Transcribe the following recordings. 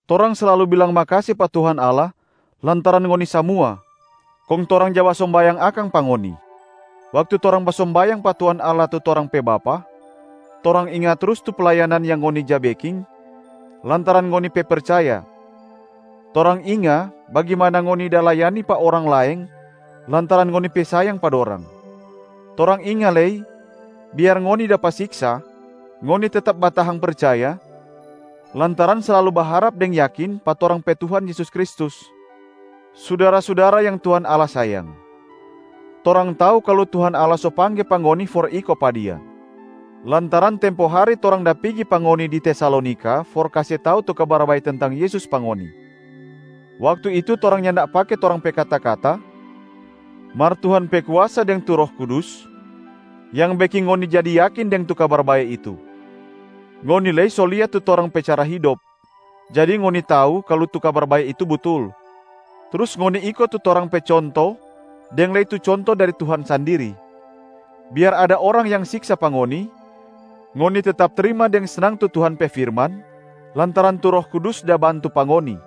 Torang slalu bilang makase pa Tuhan Allah lantaran ngoni samua, kong torang ja basombayang akang pa ngoni. Waktu torang basombayang pa Tuhan Allah, tu torang pe Bapa, torang inga trus tu playanan yang ngoni ja beking lantaran ngoni pe percaya. Torang inga bagimana ngoni da layani pa orang laeng lantaran ngoni pe sayang pa dorang. Torang inga lei biar ngoni dapa siksa, ngoni tetap batahang percaya lantaran slalu baharap deng yakin pa torang pe Tuhan Yesus Kristus. Sudara-sudara yang Tuhan Allah sayang, torang tau kalu Tuhan Allah so pangge pa ngoni for iko pa Dia, lantaran tempo hari torang da pigi pa ngoni di Tesalonika for kase tau tu Kabar Bae tentang Yesus pa ngoni. Waktu itu torang nyanda pake torang pe kata-kata, mar Tuhan pe kuasa deng tu Roh Kudus yang beking ngoni jadi yakin deng tu Kabar Bae itu. Ngoni lei so lia tu torang pe cara hidop, jadi ngoni tau kalu tu Kabar Bae itu butul. Trus ngoni iko tu torang pe conto deng lei tu conto dari Tuhan sandiri, biar ada orang yang siksa pa ngoni, ngoni tetap trima deng snang tu Tuhan pe firman lantaran tu Roh Kudus da bantu pa ngoni.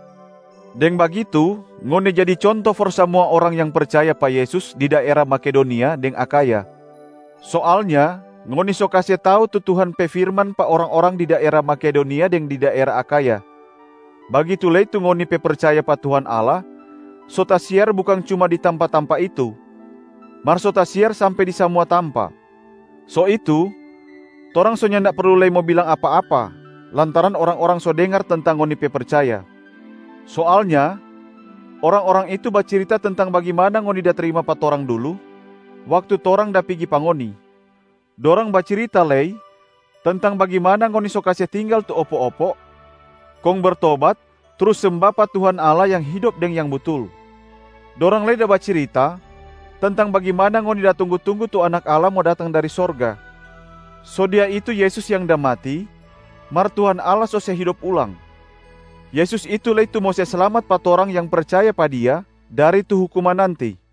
Deng bagitu ngoni jadi conto for samua orang yang percaya pa Yesus di daera Makedonia deng Akhaya. Soalnya ngoni so kase tau tu Tuhan pe firman pa orang-orang di daera Makedonia deng daera Akhaya. Bagitu lei tu ngoni pe percaya pa Tuhan Allah so tasiar bukang cuma di tampa-tampa itu, mar so tasiar sampe di samua tampa. So itu, torang so nyanda perlu lei mo bilang apa-apa lantaran orang-orang so dengar tentang ngoni pe percaya. Soalnya orang-orang itu bacirita tentang bagimana ngoni da trima pa torang dulu waktu torang da pigi pa ngoni. Dorang bacirita lei tentang bagimana ngoni so kase tinggal tu opo-opo kong bertobat trus semba pa Tuhan Allah yang hidop deng yang butul. Dorang lei da bacirita tentang bagimana ngoni da tunggu-tunggu tu Anak Allah mo datang dari sorga. So Dia itu Yesus yang da mati mar Tuhan Allah so se hidop ulang. Yesus itu lei tu mo se slamat pa torang yang percaya pa Dia dari tu hukuman nanti.